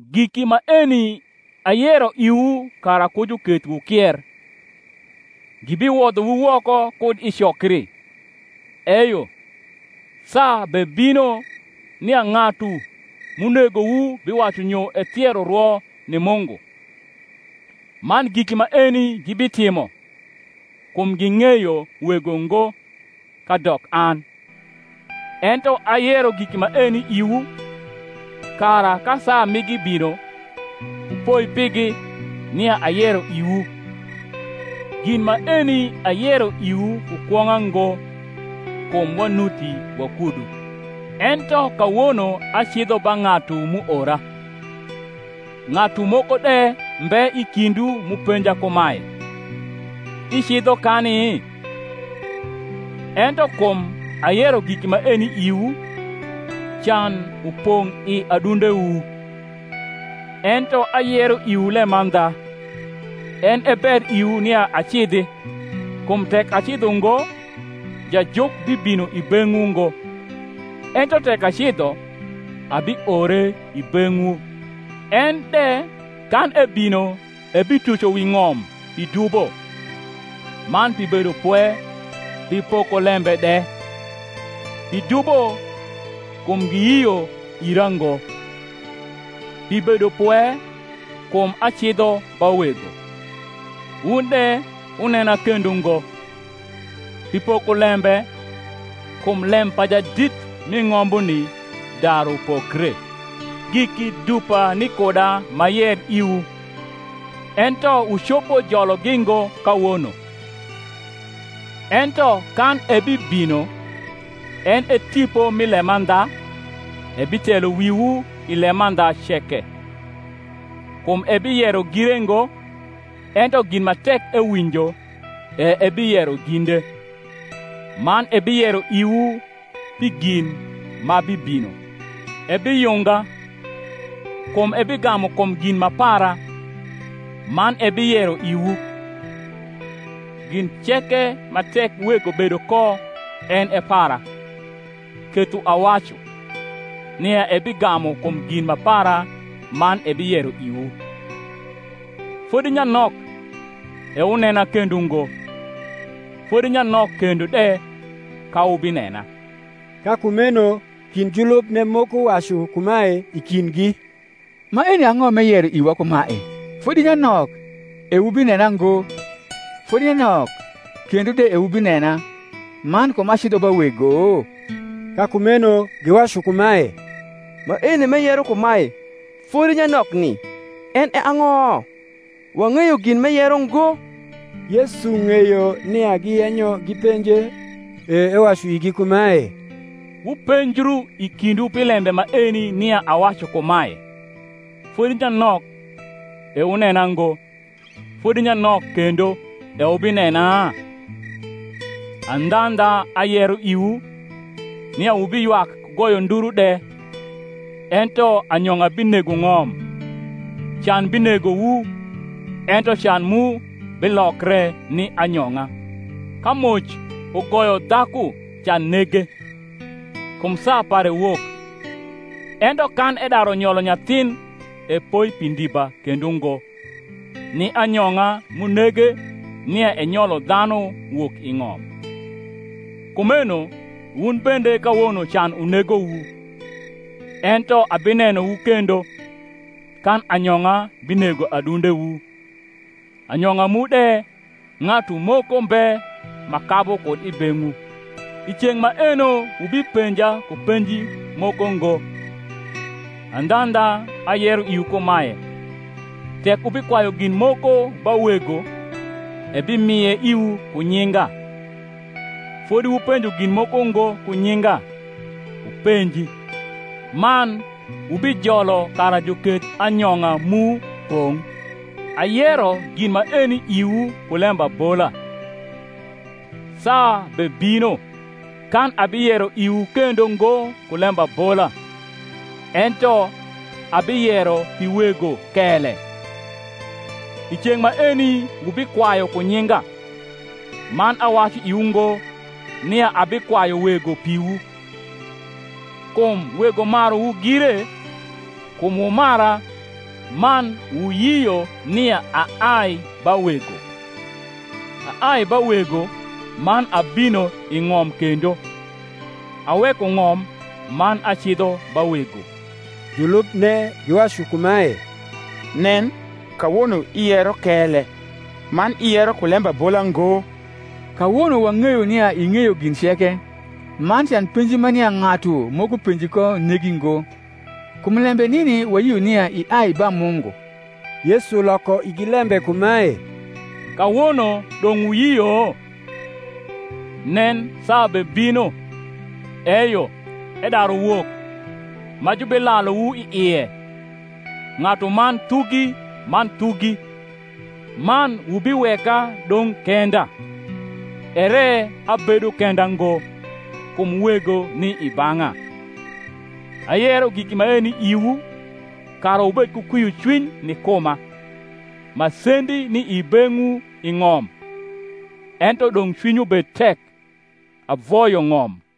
Giki maeni ayero iwu, kara ku juketh wukier. Gibiwodhowu woko kud i cokri: eyo, saa bebino, nia ng’atu m’unegowu biwacu nyo ethiero rwo ni Mungu. Man giki maeni gibitimo, kum ging’eyo Wego ngo, kadok an. Ento ayero giki maeni iwu, kara ka saa migi bino, wupoi pigi, nia ayero iwu. Gin maeni ayero iwu ku kwong’a ug, kum wanuti wakudu. Ento kawono acidho ba ng’atu m’uora; ng’atu moko de mbe i kindwu m’upenja kumae, Icidho kani? Ento kum ayero giki maeni iwu, can upong’ i adundewu. Ento ayero iwu lemandha: en e ber iwu nia acidhi; kum tek acidho ngo, Jajuk bibino i beng’wu ngo; ento tek acidho, abiore i beng’wu. En de, kan ebino, ebituco wi ng’om pi dubo, man pi bedopwe, pi pokoiembe de: pi dubo, kum giyio ira ngo; pi bedopwe, kum acidho ba Wego, wun de wunena kendo ngo; pi pokolembe, kum lem pa jadit mi ng’ombuni daru pokre. Giki dupa ni kuda m’ayer iwu, ento wucopo jologi ngo kawono. Ento kan ebibino, en e Tipo mi lemandha, ebitelo wiwu i lemandha ceke: kum ebiyero gire ngo; ento gin ma tek ewinjo, e ebiyero ginde: man ebiyero iwu pi gin ma bibino. Ebiyunga: kum ebigamu kum gin ma para, man ebiyero iwu. Gin ceke ma tek Wego bedo ko en e para: ketho awacu, nia ebigamu kum gin ma para man ebiyero iwu. Fodi nyanok, e wunena kendo ngo: fodi nyanok kendo de, ka wubinena. Ka kumeno kind julubne moko wacu kumae i kindgi, Maeni ang’o m’eyero iwa kumae, Fodi nyanok, e wubinena ngo; fodi nyanok kendo de e wubinena: man, Kum acidho ba Wego? Ka kumeno giwacu kumae, Maeni m’eyero kumae, Fodi nyanokni en e ang’o? Wang’eyo gin m’eyero ngo. Yesu ng’eyo nia giyenyo gipenje, e ewacu igi kumae, Wupenjru i kindwu pi lembe maeni nia awacu kumae, Fodi nyanok, e wunena ngo, fodi nyanok kendo, e wubinena? Andhandha, ayero iwu, nia wubiywak ku goyo nduru de, ento anyong’a binego ng’om: can binegowu, ento can mu bilokre ni anyong’a. Ka moc ugoyo dhaku can nege, kum saa pare wok: ento kan edaru nyolo nyathin epoi pi ndiba kendo ngo, ni anyong’a m’unege nia enyolo dhanu wok i ng’om. Kumeno wun bende kawono can unegowu: ento abinenowu kendo, kan anyong’a binego adundewu, anyong’a mu de ng’atu moko mbe ma kabu kud i beng’wu. I ceng’ maeno wubipenja ku penji moko ngo. Andhandha, ayero iwu kumae, Tek wubikwayu gin moko ba Wego, ebimie iwu ku nyinga. Fodi wupenjo gin moko ngo ku nyinga: wupenji, man wubijolo kara juketh anyong’a mu pong’. Ayero gin maeni iwu ku lembabola: saa bebino, kan abiyero iwu kendo ngo ku lembabola, ento abiyero pi Wego kele. I ceng’ maeni wubikwayu ku nyinga: man awacu iwu ngo, nia abikwayu Wego piwu; kum Wego maruwu gire, kum wumara, man wuyio nia aai ba Wego. Aai ba Wego, man abinoi ng’om kendo, aweko ng’om, man acidho ba Wego. Julubne giwacu kumae, Nen, kawono iyero kele, man iyero ku lembabola ngo. Kawono wang’eyo nia ing’eyo gin ceke, man can penji ma nia ng’atu moko penji ko negi ngo: kum lembe nini wayio nia iai ba Mungu. Yesu loko igi lembe kumae, Kawono dong’ wuyio? Nen, saa bebino, eyo, edaru wok, ma jubilaluwu i ie, ng’atuman thugi man thugi, man wubiweka dong’ kenda; ere abedo kenda ngo, kum Wego ni i bang’a. Ayero giki maeni iwu, kara wubed ku kwiocwiny ni kuma. Masendi ni i beng’wu i ng’om: ento dong’ cwinywu bed tek; avoyo ng’om.